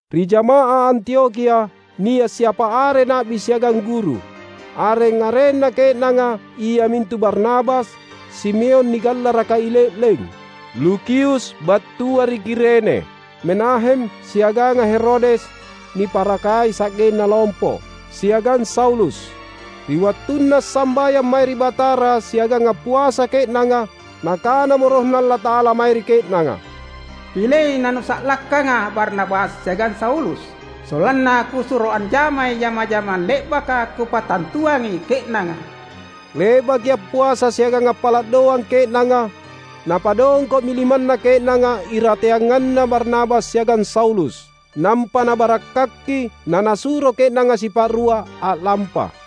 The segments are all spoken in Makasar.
Ri jamaah Antiokhia nia’ siapa are na’bi siagang guru. Areng-arenna ke’nanga iamintu: Barnabas, Simeon nigallaraka I Le’leng, Lukius battua ri Kirene, Menahem siaganga Herodes niparakai sa’genna lompo, siagang Saulus. Ri wattunna assambayang mae ri Batara siagang appuasa ke’nanga, Nakanamo RohNa Allata’ala mae ri ke’nanga, "Pilei nanusa’lakkangA’ Barnabas siagang Saulus, sollanna Kusuro anjamai jama-jamang le’baka Kupattantuangi ke’nanga." Le’baki appuasa siagang appala’ doang ke’nanga, napadongko’mi limanna ke’nanga irateanganna Barnabas siagang Saulus, nampa nabarakkaki nanasuro ke’nanga sipa’rua a’lampa.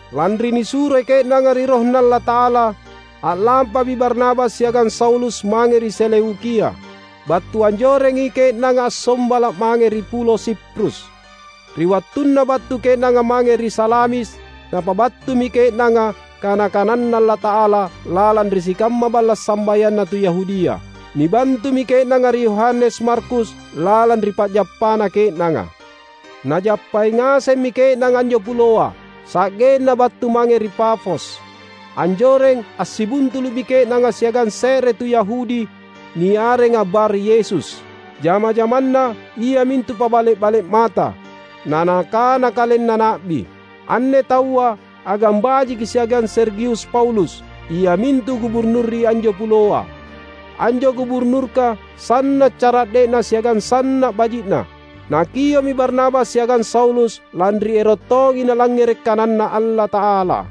Lanri nisuroi ke’nanga ri RohNa Allata’ala, a’lampami Barnabas siagang Saulus mange ri Seleukia. Battu anjorengi ke’nanga assombala’ mange ri pulo Siprus. Ri wattunna battu ke’nanga mange ri Salamis, napabattumi ke’nanga kana-kananNa Allata’ala lalang ri sikamma balla’ sambayanna tu Yahudia. Nibantumi ke’nanga ri Yohanes Markus lalang ri pa’jappanna ke’nanga. Najappai ngasemmi ke’nanga anjo puloa, sa’genna battu mange ri Pafos. Anjoreng assibuntulu’mi ke’nanga siagang se’re tu Yahudi, niarenga Bar Yesus. Jama-jamanna iamintu pabale’-bale’ mata, na nakana kalenna na’bi. Anne taua agang bajiki siagang Sergius Paulus, iamintu Guburnur ri anjo puloa. Anjo Guburnurka sanna’ cara’de’na siagang sanna’ baji’na. Nakio’mi Barnabas siagang Saulus lanri ero’ tongi nalangngere’ kananNa Allata’ala.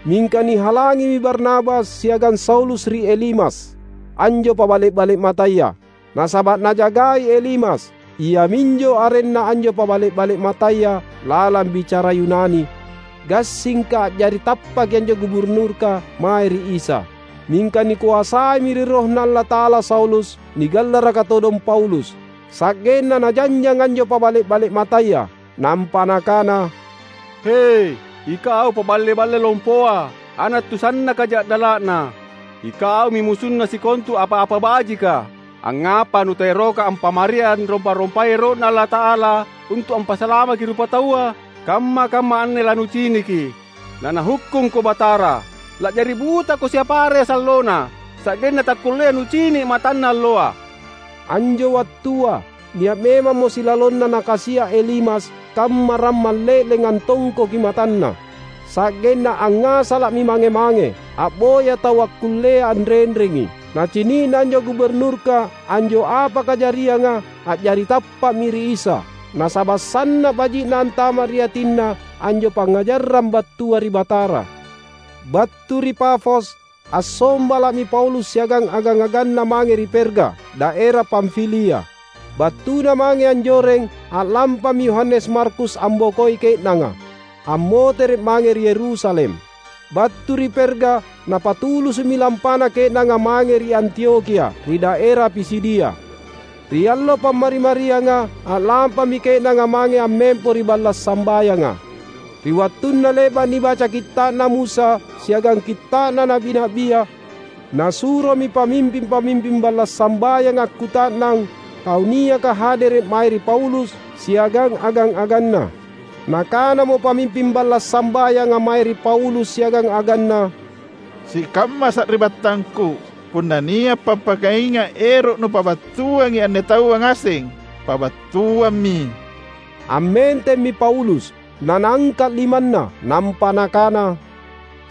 Mingka nihalangimi Barnabas siagang Saulus ri Elimas, anjo pabale’-bale’ mataya. Nasaba’ najagai Elimas (iaminjo arenna anjo pabale’-bale’ mataya lalang bicara Yunani) gassingka a’jari tappaki anjo Guburnurka mae ri Isa. Mingka nikoasaimi ri RohNa Allata’ala Saulus — nigallaraka todong Paulus; sa’genna najanjang anjo pabale’-bale’ mataya, nampa nakana, "He, ikau paballe-balle lompoa, ana’ tu sannaka ja’dala’na! Ikaumi musunna sikontu apa-apa bajika. Angngapa nutaeroka ampamari anrompa-rompai ero’Na Allata’ala untu’ ampasalamaki rupataua? Kamma-kamma anne lanuciniki, naNahukkungko Batara! La’jari butako siapa are sallona, sa’genna takkullea nucini’ matanna alloa." Anjo wattua nia’ memammo silalonna nakasia’ Elimas kamma rammang le’leng antongkoki matanna. Sa’genna angngasala’mi mange-mange, a’boya tau akkullea anrenrengi. Nacini’na anjo Guburnurka anjo apa kajarianga, a’jari tappa’mi ri Isa. Nasaba’ sanna’ baji’na antama’ ri atinna anjo pangngajarang battua ri Batara. Battu ri Pafos, assombala’mi Paulus siagang agang-aganna mange ri Perga, daera Pamfilia. Battuna mange anjoreng a’lampami Yohanes Markus ambokoi ke’nanga, ammotere’ mange ri Yerusalem. Battu ri Perga, napatulusu’mi lampana ke’nanga mange ri Antiokhia, ri daera Pisidia. Ri allo Pammari-marianga, a’lampami ke’nanga mange ammempo ri balla’ sambayanga. Ri wattunna le’ba’ nibaca Kitta’na Musa siagang Kitta’na Na’bi-na’bia, nasuromi pamimping-pamimping balla’ sambayanga akkuta’nang tau niaka hadere’ mae ri Paulus siagang agang-aganna. Nakanamo pamimping balla’ sambayanga mae ri Paulus siagang aganna, "Sikamma sari’battangku, punna nia’ pappakainga’ ero’ nupabattuangi anne taua ngaseng, pabattuammi." Ammentemmi Paulus, nanaangka’ limanna, nampa nakana,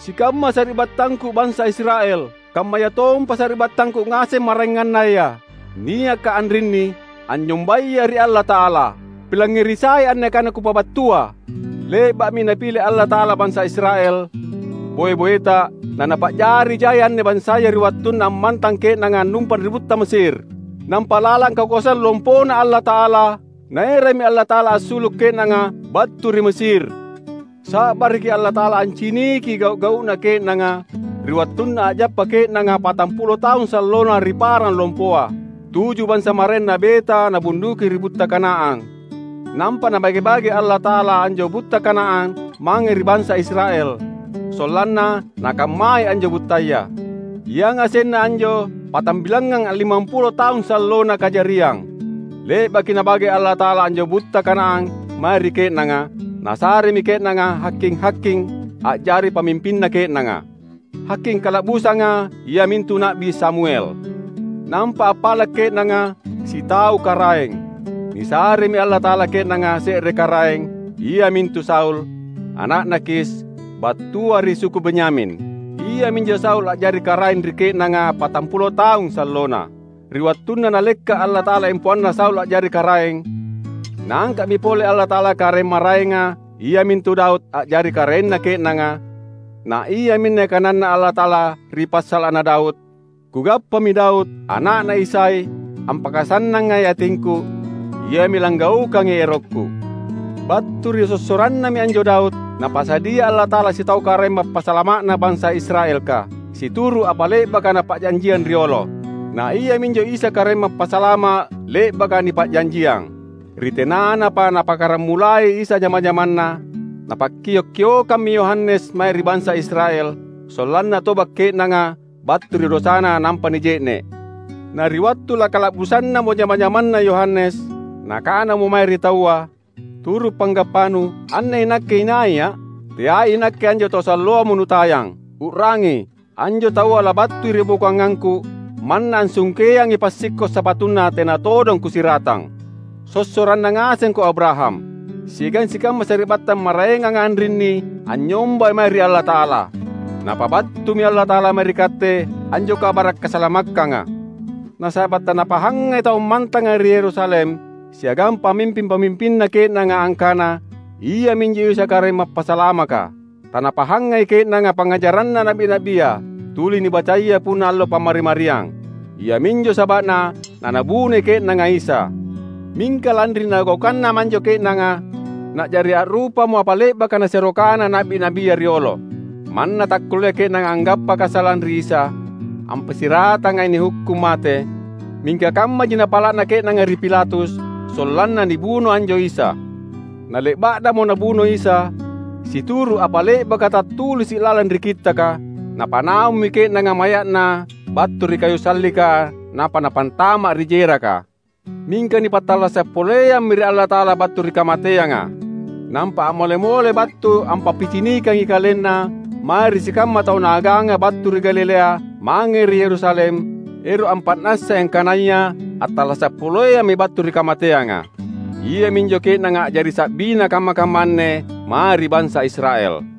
"Sikamma sari’battangku bansa Israel, kammayatompa sari’battangku ngaseng maraengannaya, niaka anrinni, anynyombaya ri Allata’ala. Pilangngeri sai anne kana kupabattua: Le’ba’mi Napile Allata’ala bansa Israel, boe-boeta, naNapa’jari jai anne bansaya ri wattunna ammantang ke’nanga annumpang ri butta Mesir. Nampa lalang kakoasang lompoNa Allata’ala, Naerammi Allata’ala assulu’ ke’nanga battu ri Mesir. Sa’baraki Allata’ala anciniki gau’-gau’na ke’nanga ri wattunna a’jappa ke’nanga patampulo taung sallona ri parang lompoa. Tuju bansa maraeng nabeta Nabunduki ri butta Kanaan. Nampa Nabage-bage Allata’ala anjo butta Kanaan mange ri bansa Israel, sollanna nakammai anjo buttaya. Yangasenna anjo patambilangngang allimampulo taung sallona kajariang. Le’baki Nabage Allata’ala anjo butta Kanaan mae ri ke’nanga, Nasaremi ke’nanga haking-haking a’jari pamimpinna ke’nanga. Haking kala’busanga iamintu Na’bi Samuel. Nampa appala’ ke’nanga sitau karaeng. Nisaremi Allata’ala ke’nanga se’re karaeng, iamintu Saul, ana’na Kis, battua ri suku Benyamin. Iaminjo Saul a’jari karaeng ri ke’nanga patampulo taung sallona. Ri wattunna Nalekka’ Allata’ala empoanna Saul a’jari karaeng, Naangka’mi pole Allata’ala karaeng maraenga iamintu Daud a’jari karaenna ke’nanga na iaminne kananNa Allata’ala ri passala’na Daud, ‘Kugappami Daud, ana’na Isai, ampakasannangai atingKu. Iami langgaukangi erokKu.’ Battu ri sossorannami anjo Daud, Napasadia Allata’ala sitau Karaeng Mappasalama’na bansa Israelka, situru’ apa le’baka Napa’janjiang riolo. Na iaminjo Isa Karaeng Mappasalama’ le’baka nipa’janjiang. Ri tenanapa Napakkaramulai Isa jama-jamanNa, napakkio’-kiokammi Yohanes mae ri bansa Israel, sollanna toba’ ke’nanga battu ri dosana nampa nije’ne’. Na ri wattu lakala’busannamo jama-jamanna Yohanes, nakanamo mae ri taua, ‘Turu’ panggappanu, anne inakke inaia’? Teai inakke anjo Tau salloamo nutayang. U’rangi, anjo Taua labattui ri bokoangangku; manna assungkeangi passikko’ sapatuNa tena todong kusiratang.’ Sossoranna ngasengko Abraham. Siagang sikamma sari’battang maraenganga anrinni anynyombai mae ri Allata’ala! Napabattumi Allata’ala mae ri katte anjo kabara’ kasalamakkanga; nasaba’ tanapahangai tau ammantanga ri Yerusalem siagang pamimping-pamimpinna ke’nanga angkana Iaminjo Isa Karaeng Mappasalamaka. Tanapahangai ke’nanga pangngajaranna na’bi-na’bia, tuli nibacaya punna allo Pammari-mariang. Iaminjo saba’na nanabunoi ke’nanga Isa. Mingka lanri nagaukannamo anjo ke’nanga, na’jari a’rupamo apa le’baka nasero kana na’bi-na’bia riolo. Manna takkullea ke’nanga anggappa kasalang ri Isa, ampassiratangai nihukkung mate, mingka kammaji napala’na ke’nanga ri Pilatus, sollanna nibuno anjo Isa. Na le’ba’namo nabuno Isa, situru’ apa le’baka tattulisi’ lalang ri Kittaka, napanaummi ke’nanga maya’Na battu ri kayu sallika nampa napantama’ ri jeraka. Mingka nipattallasa’ poleammi ri Allata’ala battu ri kamateanga. Nampa a’mole-mole battu ampappicinikangi KalenNa mae ri sikamma tau Naaganga battu ri Galilea mange ri Yerusalem, ero’ ampa’nassai angkanaya attallasa’ poleammi battu ri kamateanga. Iaminjo ke’nanga a’jari sa’biNa kamma-kamma anne mae ri bansa Israel.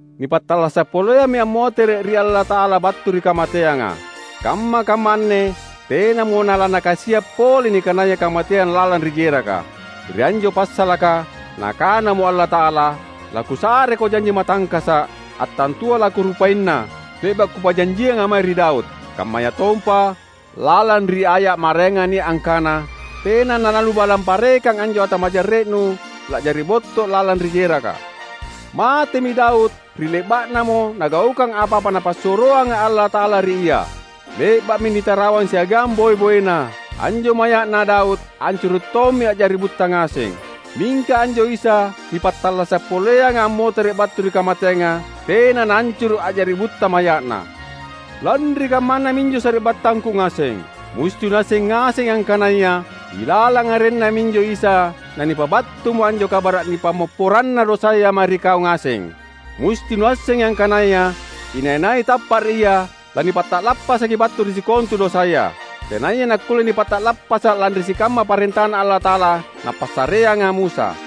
Nipattallasa’ poleammi ammotere’ ri Allata’ala battu ri kamateanga. Kamma-kamma anne tenamo nalaNakasia’ pole nikanaya kamateang lalang ri jeraka. Ri anjo passalaka Nakanamo Allata’ala, ‘LaKusareKo janji matangkasa’, attantua laKurupaina, le’ba’ Kupa’janjianga mae ri Daud.’ Kammayatompa, lalang ri aya’ maraenga nia’ angkana, ‘Tena nalaNubalang parekang anjo Ata majarre’Nu la’jari botto’ lalang ri jeraka.’ Matemi Daud ri le’ba’namo nagaukang apa-apa Napassuroanga Allata’ala ri ia. Le’ba’mi nitarawang siagang boe-boena. Anjo maya’na Daud ancuru’ tommi a’jari butta ngaseng. Mingka anjo Isa, nipattallasa’ poleanga ammotere’ battu ri kamateanga, tena naancuru’ a’jari butta maya’Na. Lanri kammana minjo sari’battangku ngaseng, musti nuasseng ngasengi angkanaya ilalang arenNa minjo Isa nanipabattumo anjo kabara’ nipammopporanna dosaya mae ri kau ngaseng; musti nuassengi angkanaya inai-nai tappa’ ri Ia, lanipata’lappasaki battu ri sikontu dosaya, tenaya nakkulle nipata’lappasa’ lanri sikamma parentaNa Allata’ala napassareanga Musa.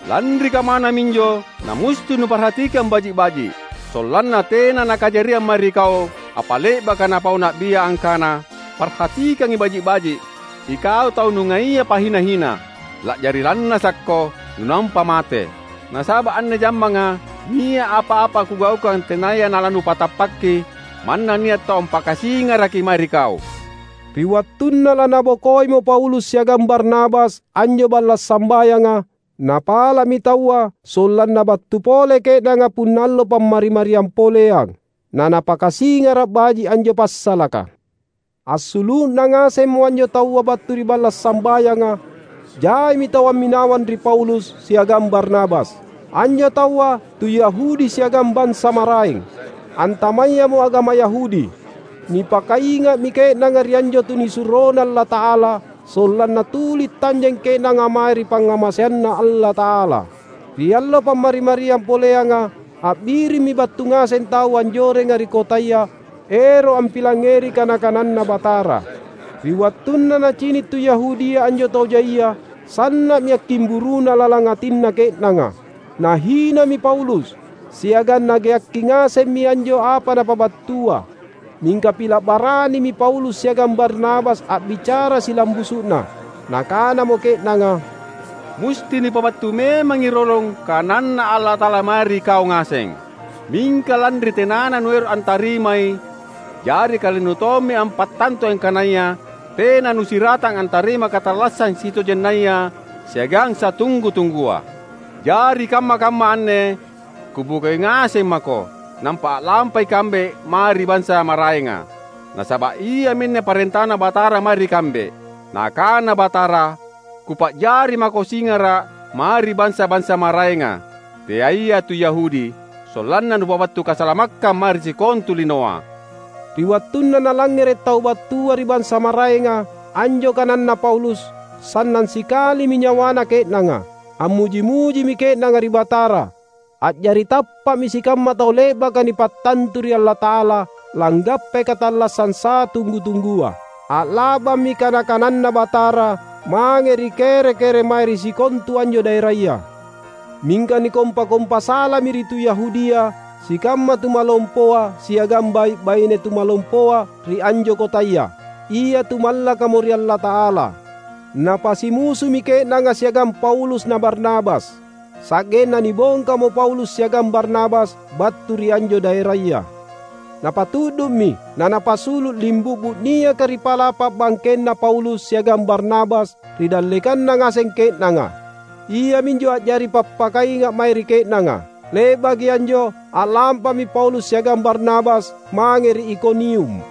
Lanri kammana minjo namusti nuparhatikang baji’-baji’, sollanna tena nakajariang mae ri kau apa le’baka napau na’bia, angkana, ‘Parhatikangi baji’-baji’ ikau tau nungaia pahina-hina! La’jari lannasakko, nunampa mate! Nasaba’ anne jammanga nia’ apa-apa Kugaukang tenaya nalanupatappaki, manna nia’ tau ampakasingaraki mae ri kau.’" Ri wattunna lanabokoimo Paulus siagang Barnabas anjo balla’ sambayanga, napala’mi taua sollanna battu pole ke’nanga punna allo Pammari-mariang poleang, nanapakasingara’ baji’ anjo passalaka. Assulu’na ngasemmo anjo taua battu ri balla’ sambayanga, jaimi tau amminawang ri Paulus siagang Barnabas. Anjo taua tu Yahudi siagang bansa maraeng, antamayamo agama Yahudi. Nipakainga’mi ke’nanga ri anjo tunisuroNa Allata’ala, sollanna tuli tanjeng ke’nanga mae ri pangngamaseanNa Allata’ala. Ri allo Pammari-mariang poleanga, a’birimmi battu ngaseng tau anjorenga ri kotaya ero’ ampilangngeri kana-kananNa Batara. Ri wattunna nacini’ tu Yahudia anjo tau jaia, sanna’mi akkimburuna lalang atinna ke’nanga. Nahinami Paulus, siagang nageakki ngasemmi anjo apa napabattua. Mingka pila’ baranimi Paulus siagang Barnabas a’bicara silambusu’na. Nakanamo ke’nanga, "Musti nipabattu memangi rolong kananNa Allata’ala mae ri kau ngaseng. Mingka lanri tenana nuero’ antarimai, jari kalennu tommi ampattantui angkanaya tena nusiratang antarimai katallassang sitojennaya siagang satunggu-tunggua. Jari kamma-kamma anne kubokoi ngaseng mako, nampa a’lampa ikambe mae ri bansa maraenga. Nasaba’ iaminne parentaNa Batara mae ri kambe; Nakana Batara, ‘Kupa’jari mako singara’ mae ri bansa-bansa maraenga, teaiya tu Yahudi, sollanna nupabattu kasalamakkang mae ri sikontu linoa.’" Ri wattunna nalangngere’ tau battua ri bansa maraenga anjo kananna Paulus, sannang sikalimi nyawana ke’nanga. Ammuji-mujimi ke’nanga ri Batara. A’jari tappa’mi sikamma tau le’baka nipattantu ri Allata’ala langgappai katallassang satunggu-tunggua. A’la’bammi kana-kananNa Batara mange ri kere-kere mae ri sikontu anjo daeraya. Mingka nikompa-kompa salami ri tu Yahudia sikamma tumalompoa siagang bai’-baine tumalompoa ri anjo kotaya, ia tu mallakamo ri Allata’ala. Napasimusumi ke’nanga siagang Paulus na Barnabas. Sa’genna nibongkamo Paulus siagang Barnabas battu ri anjo daeraya. Napatu’du’mi nanapasulu’ limbu’bu’ niaka ri pa’lapa’ bangkenna Paulus siagang Barnabas ri dallekanna ngaseng ke’nanga. Iaminjo a’jari pappakainga’ mae ri ke’nanga. Le’baki anjo a’lampami Paulus siagang Barnabas mange ri Ikonium.